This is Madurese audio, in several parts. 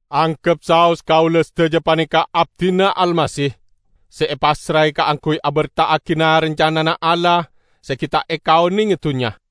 Anggep saos kaula sadaja paneka abdina Almasih, se epassrae kaangguy aberta'agi na-rancanana Allah se gi' ta' ekaonenge dunnya.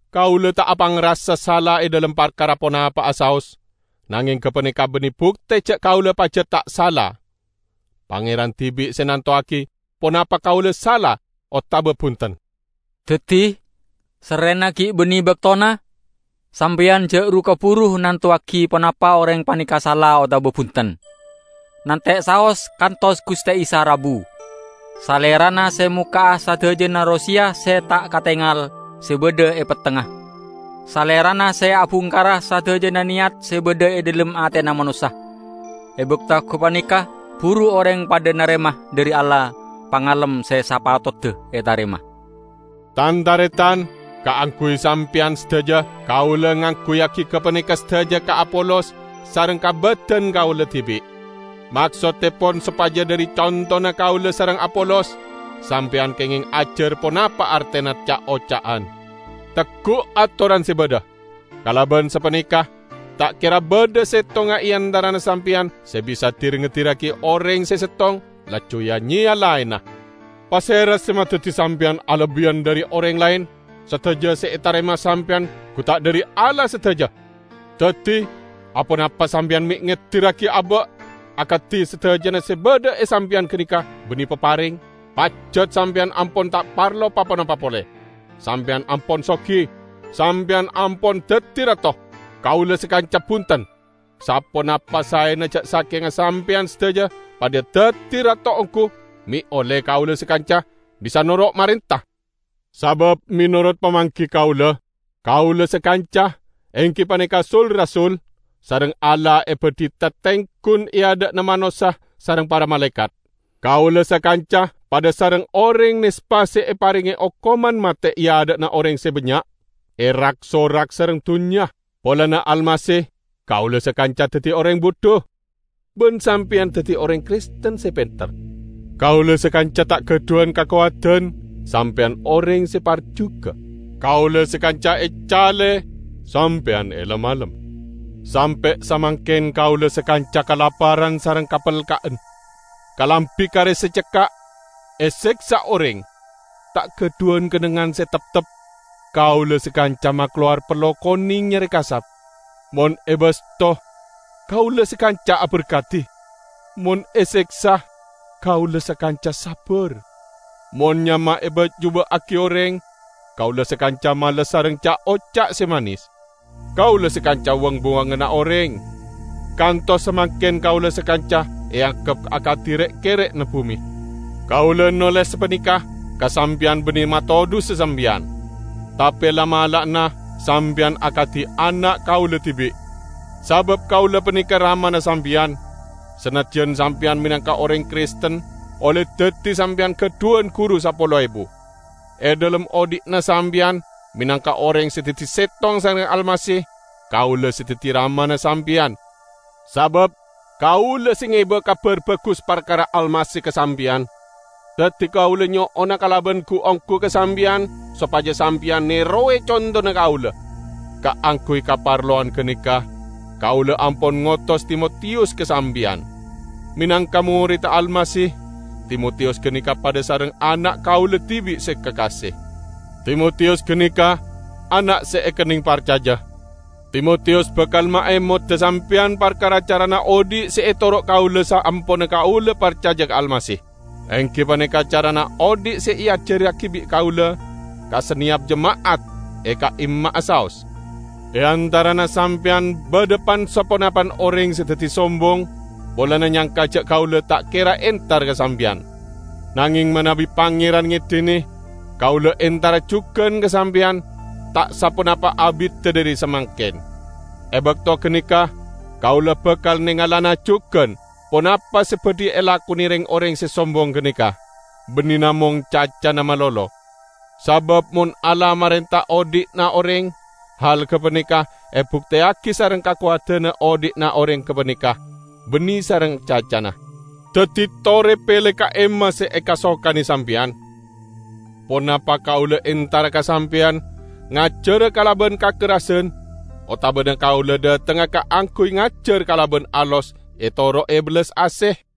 Kaula ta' apangrasa sala e dhalem parkara ponapa'a saos, nangeng gapaneka banne bukte ja' kaula pajat ta' sala. Pangeran dibi' se nantowagi ponapa kaula sala otaba bunten. Daddi, sarrena gi' banne baktona, sampeyan ja' ru-kaburu nantowagi ponapa oreng paneka sala otaba bunten. Nante' saos kantos Guste Isa rabu. Salerana se mokka'a sadajana roseya se ta' katengal, se badha e pettengna. Salerana se abungkara sadajana neyat se badha e dhalem atena manossa. E bakto gapaneka buru oreng padha narema dhari Allah pangalem se sapatodda etarema. Tan-taretan! Kaangguy sampeyan sadaja, kaula ngangguyyagi gapaneka sadaja ka Apolos sareng ka badan kaula dibi'. Maksottepon sopaja dhari contona kaula sareng Apolos, sampeyan kengeng ajar ponapa artena ca'-oca'an. "Teggu' atoran se badha". Kalaban sapaneka ta' kera badha settongnga e antarana sampeyan se bisa dir-ngedirragi oreng se settong, laju ya-nyeya laenna. Pasera se madaddi sampeyan alebbiyan dhari oreng laen? Sadaja se etarema sampeyan gu ta' dhari Allah sadaja? Daddi, aponapa sampeyan me' ngedirragi aba', akadi sadajana se badha e sampeyan ganeka banne papareng? Pajat sampeyan ampon ta' parlo pa-ponapa pole! Sampeyan ampon sogi! Sampeyan ampon daddi rato! Kaula sakanca bunten. Saponapa saena ja' sakenga sampeyan sadaja padha daddi rato onggu, me' olle kaula sakanca bisa noro' marenta. Sabab menorot pamanggi kaula, kaula sakanca, enggi paneka sul-rasul, sareng Allah ebadhi tatenggun e adha'na manossa sareng para malaekat. Kaula sakanca padha sareng oreng nespa se eparenge okoman mate e adha'na oreng se bannya', erak-sorak sareng dunnya. Polana Almasih, kaula sakanca daddi oreng budhu, ban sampeyan daddi oreng Kristen se penter! Kaula sakanca ta' gadhuwan kakowadan, sampeyan oreng se parjuga! Kaula sakanca ecale, sampeyan elem-alem! Sampe' samangken kaula sakanca kalaparan sareng kapelka'en; kalambi kare se cekka'; eseksa oreng; ta' gadhuwan kennengngan se teptep; kaula sakanca makalowar pello koneng nyare kasap. Mon ebasto, kaula sakanca aberkadi; mon eseksa, kaula sakanca sabbar; mon nyama eba'juba'agi oreng, kaula sakanca males sareng ca'-oca' se manes. Kaula sakanca wang-buwanganna oreng; kantos samangken kaula sakanca eanggep akadi re'-kerre'na bume. Kaula noles sapaneka ka sampeyan banne matodhusa sampeyan, tape la'-mala'ana sampeyan akadi ana' kaula dibi'. Sabab kaula paneka ramana sampeyan, sanajjan sampeyan menangka oreng Kristen olle daddi sampeyan gadhuwan guru sapolo ebu. E dhalem odhi'na sampeyan menangka oreng se daddi settong sareng Almasih, kaula se daddi ramana sampeyan, sabab kaula se ngeba Kabar Bagus parkara Almasih ka sampeyan. Daddi kaula nyo'ona kalaban gu-onggu ka sampeyan sopaja sampeyan nerowe contona kaula. Kaangguy kaparlowan ganeka kaula ampon ngotos Timotiyus ka sampeyan. Menangka moredda Almasih, Timotiyus ganeka padha sareng ana' kaula dibi' se kakase. Timotiyus ganeka ana' se ekenneng parcaja. Timotiyus bakal maemoda sampeyan parkara carana odhi' se etoro' kaula saamponna kaula parcaja ka Almasih, enggi paneka carana odhi' se eajarragi bi' kaula ka saneyap jema'at e ka'imma'a saos. E antarana sampeyan badha pan-saponapan oreng se daddi sombong polana nyangka ja' kaula ta' kera entar ka sampeyan. Nangeng manabi Pangeran ngedine, kaula entara jugan ka sampeyan ta' saponapa abidda dhari samangken. E bakto ganeka kaula bakal nengalana jugan ponapa se badhi elakone reng-oreng se sombong ganeka; banne namong cacana malolo. Sabab mon Allah marenta odhi'na oreng, hal gapaneka ebukteyagi sareng kakowadanna odhi'na oreng gapaneka, banne sareng cacana. Daddi tore pele ka'imma se ekasokane sampeyan! Ponapa kaula entara ka sampeyan ngajara kalaban kakerrasan otabana kaula dhatengnga kaangguy ngajar kalaban alos etoro'e bellas ase?